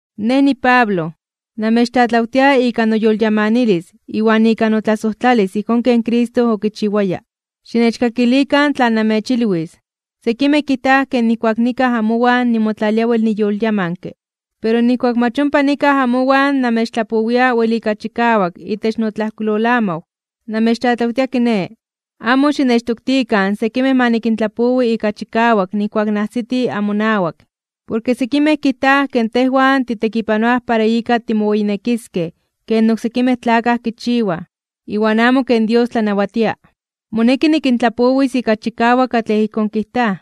Nej, niPablo, namechtlatlawtia ika noyolyamanilis iwan ika notlasojtlalis ijkón ken Cristo okichiwaya, xinechkakilikan tlan namechilwis. Sekimej kijtaj ke nijkuak nikaj amowan nimotlalia wel niyolyamanke, pero nijkuak mach ompa nikaj amowan namechtlapowia wel ika chikawak itech notlajkuilolamaw. Namechtlatlawtia kiné, amo xinechtoktikan sekimej ma nikintlapowi ika chikawak nijkuak najsiti amonawak. Porke sekimej kijtaj ke tejwan titekipanoaj para ika timoweyinekiskej ken oksekimej tlakaj kichiwaj, iwan amo ken Dios tlanawatia. Moneki nikintlapowis ika chikawak katlej ijkón kijtaj.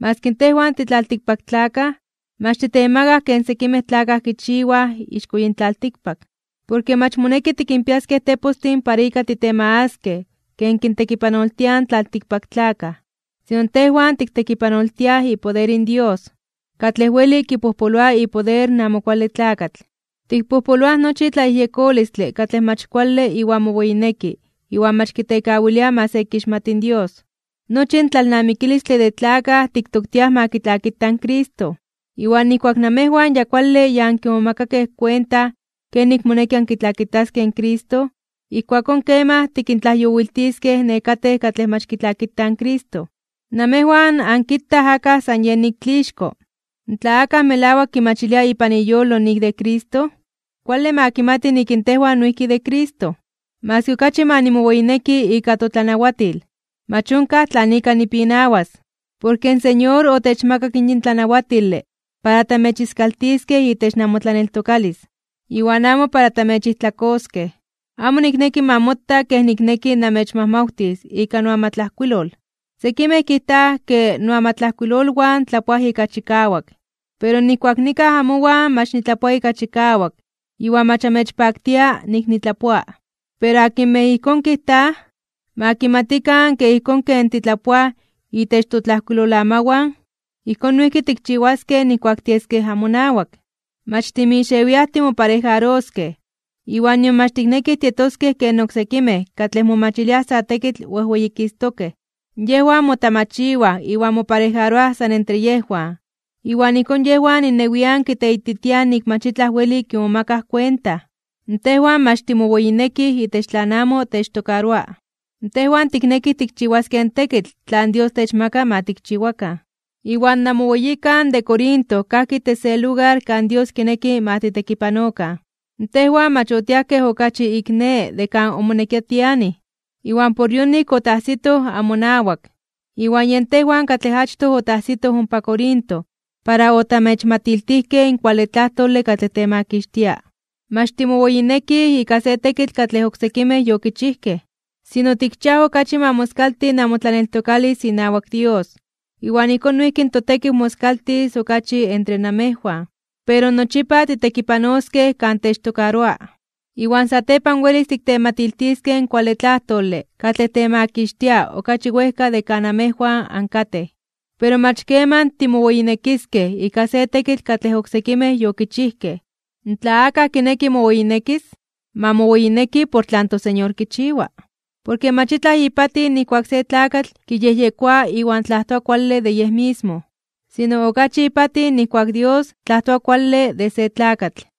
Maski tejwan titlaltikpaktlakaj, mach titemagaj ken sekimej tlakaj kichiwaj ixko yin tlaltikpak. Porke mach moneki tikinpiaskej tepostin para ika titemagaskej ken kintekipanoltiaj in tlaltikpaktlakaj, sino tejwan tiktekipanoltiaj ipoder in Dios, katlej weli kipojpoloa ipoder in Amo Kuale Tlakatl. Tikpojpoloaj nochi tlayejyekolistle katlej mach kuale iwan moweyineki iwan mach kitekawilia ma se kixmati in Dios. Nochi in tlalnamikilistle de tlakaj tiktoktiaj ma kitlakita in Cristo. Iwan nijkuak namejwan ya kuale ya ankimomakakej kuenta kenik moneki ankitlakitaskej in Cristo, ijkuakón kemaj tikintlajyowiltiskej nekatej katlej mach kitlakitaj in Cristo. Namejwan ankitaj akaj san yen ik tlixko. Tla akaj melawak kimachilia ipan iyolo nik de Cristo, kuale ma kimati nik in tejwan noijki de Cristo. Maski okachi ma nimoweyineki ika totlanawatil, mach onkaj tlan ika nipinawas, porke in Señor otechmakak yin tlanawatile para tamechiskaltiskej itech namotlaneltokalis, iwan amo para tamechijtlakoskej. Amo nikneki ma mota kej nikneki namechmajmawtis ika noamatlajkuilol. Sekimej kijtaj ke noamatlajkuilolwan tlapoaj ika chikawak, pero nijkuak nikaj amowan mach nitlapoa ika chikawak iwan mach anmechpaktiaj nik nitlapoa. Pero akinmej ijkón kijtaj, ma kimatikan ke ijkón ken titlapoaj itech totlajkuilolamawan, ijkón noijki tikchiwaskej nijkuak tieskej amonawak. Mach timixewiaj timoparejaroskej iwan nion mach tiknekij tietoskej ken oksekimej katlej momachiliaj sa tekitl wejweyikistokej (wejweyititokej). Yejwan motamachiwaj iwan moparejaroaj san entre yejwan, iwan ijkón yejwan innewian kiteititiaj nik mach itlaj weli kimomakaj kuenta. Tejwan mach timoweyinekij itech tlan amo techtokaroa. Tejwan tiknekij tikchiwaskej in tekitl tlan Dios techmaka ma tikchiwakan. Iwan namoweyikan de Corinto kajki itech se lugar kan Dios kineki ma tiktekipanokan. Tejwan mach otiajkej okachi ik ne de kan omonekia tianij, iwan por yonik otajsitoj amonawak. Iwan yen tejwan katlej achtoj otajsitoj ompa Corinto para otamechmatiltijkej in kuale tlajtole katlej temakixtia. Mach timoweyinekij ika se tekitl katlej oksekimej yokichijkej. Sino tikchiaj okachi ma moskalti namotlaneltokalis inawak Dios iwan ijkón noijki in totekiw moskaltis okachi entre namejwan, pero nochipa titekipanoskej kan techtokaroa. Iwan satepan welis tiktematiltiskej in kuale tlajtole katlej temakixtia okachi wejka de kan amejwan ankatej. Pero mach keman timoweyinekiskej ika se tekitl katlej oksekimej yokichijkej. Tla akaj kineki moweyinekis, ma moweyineki por tlan toSeñor kichiwa. Porke mach itlaj ipatij nijkuak se tlakatl kiyejyekoa iwan tlajtoa kuale de yej mismo, sino okachi ipatij nijkuak in Dios tlajtoa kuale de se tlakatl.